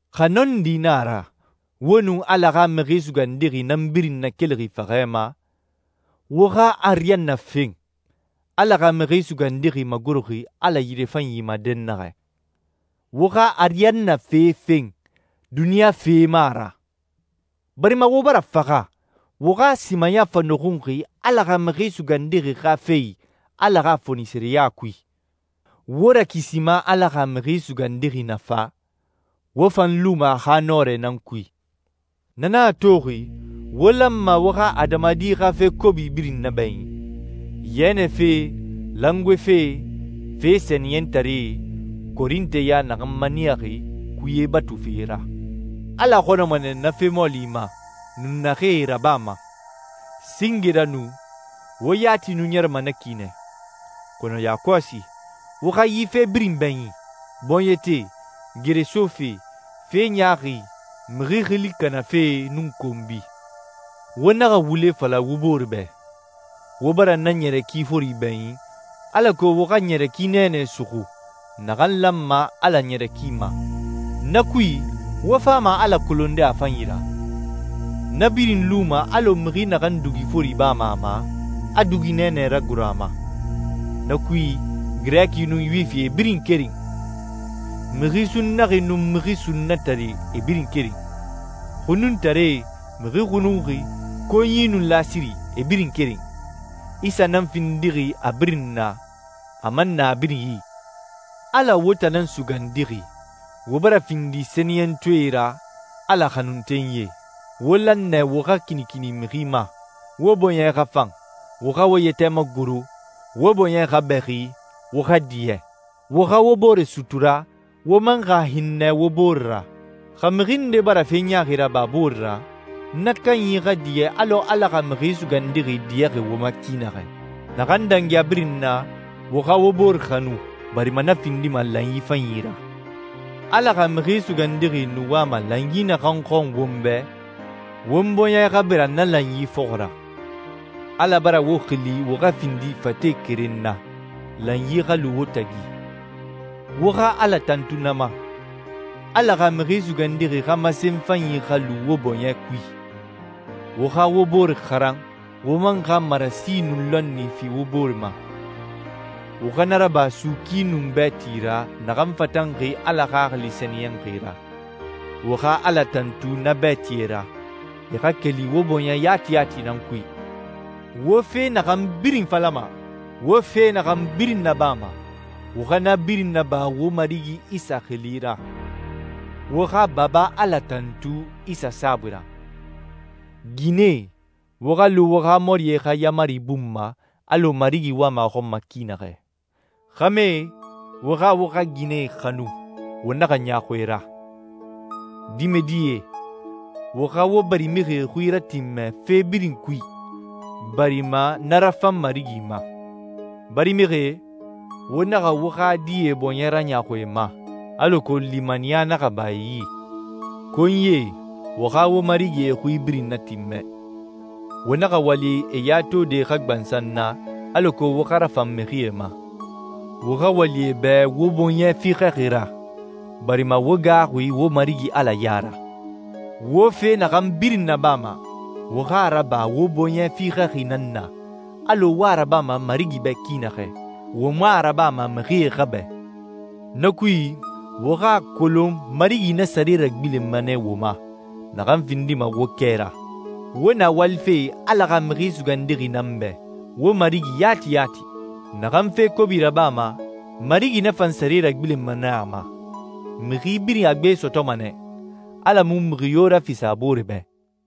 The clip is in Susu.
Xa nɔndi na a ra, wo nun Ala xa Mixi Sugandixi nan birin nakelixi faxɛ ma, wo xa ariyanna fen, Ala xa Mixi Sugandixi magoroxi Ala yirefanyi ma dɛnnaxɛ. Wo xa ariyanna fe fen, duniɲa fe mu a ra. Barima wo bara faxa, wo xa simaya fa nɔxunxi Ala xa Mixi Sugandixi xa fe i Ala xa fonisireya kui. Wo Rakisima Ala xa Mixi Sugandixi na fa, wo fan luma a xa nɔrɛ nan kui. Na nan a toxi wo lanma wo xa adamadi xa fe kobi birin nabɛɲin: yɛnɛ fe, langoe fe, fe sɛniyɛntare, korinteɲa naxan maniyaxi kuye batufe ra. Ala xɔnɔma nɛ na fe mɔɔli ma, nun naxee e rabama. Singe ra nu, wo yati nu ɲɛrɛma na ki nɛ. Kɔnɔ yakɔsi, wo xa yi fe birin bɛɲin: bɔɲɛte, geresofe, fe ɲaaxi, mixi xili kanafe, nun konbi. Wo naxa wule fala wo bore bɛ. Wo bara na ɲɛrɛ ki fori bɛɲin, alako wo xa ɲɛrɛ ki nɛɛnɛ suxu, naxan lanma Ala ɲɛrɛ ki ma. Na kui, wo fama Ala kolonde a fanyi ra. Na birin luma alɔ mixi naxan dugi fori bama a ma, a dugi nɛɛnɛ ragoro a ma. Na kui, Girɛki nun Yuwifi e birin keren. Mixi sunnaxi nun mixi sunnatare e birin keren. Xununtaree, mixi xununxi, konyi, nun lasiri, e birin keren. Isa nan findixi a birin na, a man na a birin i. Ala wo tan nan sugandixi, wo bara findi sɛniyɛntɔɛe ra, Ala xanuntenyie. Wo lan nɛ wo xa kinikini mixi ma, wo bɔɲɛ xa fan, wo xa wo yɛtɛ magoro, wo bɔɲɛ xa bɛxi, wo xa diɲɛ. Wo xa wo bore sutura, wo man xa hinnɛ wo bore ra. Xa mixi nde bara fe ɲaaxi raba a bore ra, na kanyi xa diɲɛ alɔ Ala xa Mixi Sugandixi diɲɛxi wo ma ki naxɛ. Naxan dangi a birin na, wo xa wo bore xanu barima na findima lanyi fanyi ra. Ala xa Mixi Sugandixi nu wama lanyi naxan xɔn won bɛ, won bɔɲɛ xa bira na lanyi fɔxɔ ra. Ala bara wo xili wo xa findi fate keren na, lanyi xa lu wo tagi. Wo xa Ala tantu na ma. Ala xa Mixi Sugandixi xa masenyi fanyi xa lu wo bɔɲɛ kui. Wo xa wo bore xaran, wo man xa marasi nun lɔnni fi wo bore ma. Wo xa na raba suuki nun bɛɛti ra naxan fatanxi Ala Xaxili Sɛniyɛnxi ra. Wo xa Ala tantu na bɛɛtie ra, e xa keli wo bɔɲɛ yati yati nan kui. Wo fe naxan birin falama, wo fe naxan birin nabama, wo xa na birin naba wo Marigi Isa xili ra. Wo xa Baba Ala tantu Isa saabui ra. Ginɛe, wo xa lu wo xa mɔrie xa yaamari bun ma, alɔ Marigi wama a xɔn ma ki naxɛ. Xɛmɛe, wo xa wo xa ginɛe xanu, wo naxa ɲaaxu e ra. Dimɛdie, wo xa wo barimixie xui ratinmɛ fe birin kui, barima na rafan Marigi ma. Barimixie, wo naxa wo xa die bɔɲɛ raɲaaxu e ma, alako limaniya naxa ba e yi. Konyie, wo xa wo marigie xui birin natinmɛ. Wo naxa wali e ya tode xa gbansan na, alako wo xa rafan mixie ma. Wo xa wali e bɛ wo bɔɲɛ fiixɛxi ra, barima wo gaaxuxi wo Marigi Ala ya ra. Wo fe naxan birin nabama, wo xa a raba wo bɔɲɛ fiixɛxi nan na, alɔ wo a rabama Marigi bɛ ki naxɛ. Wo mu a rabama mixie xa bɛ. Na kui, wo xa a kolon Marigi na sare ragbilenma nɛ wo ma, naxan findima wo kɛ ra. Wo na walife Ala xa Mixi Sugandixi nan bɛ, wo Marigi yati yati. Naxan fe kobi rabama, Marigi na fan sare ragbilenma nɛ a ma. Mixi birin a gbe sɔtɔma nɛ, Ala mu mixi yo rafisa a boore bɛ.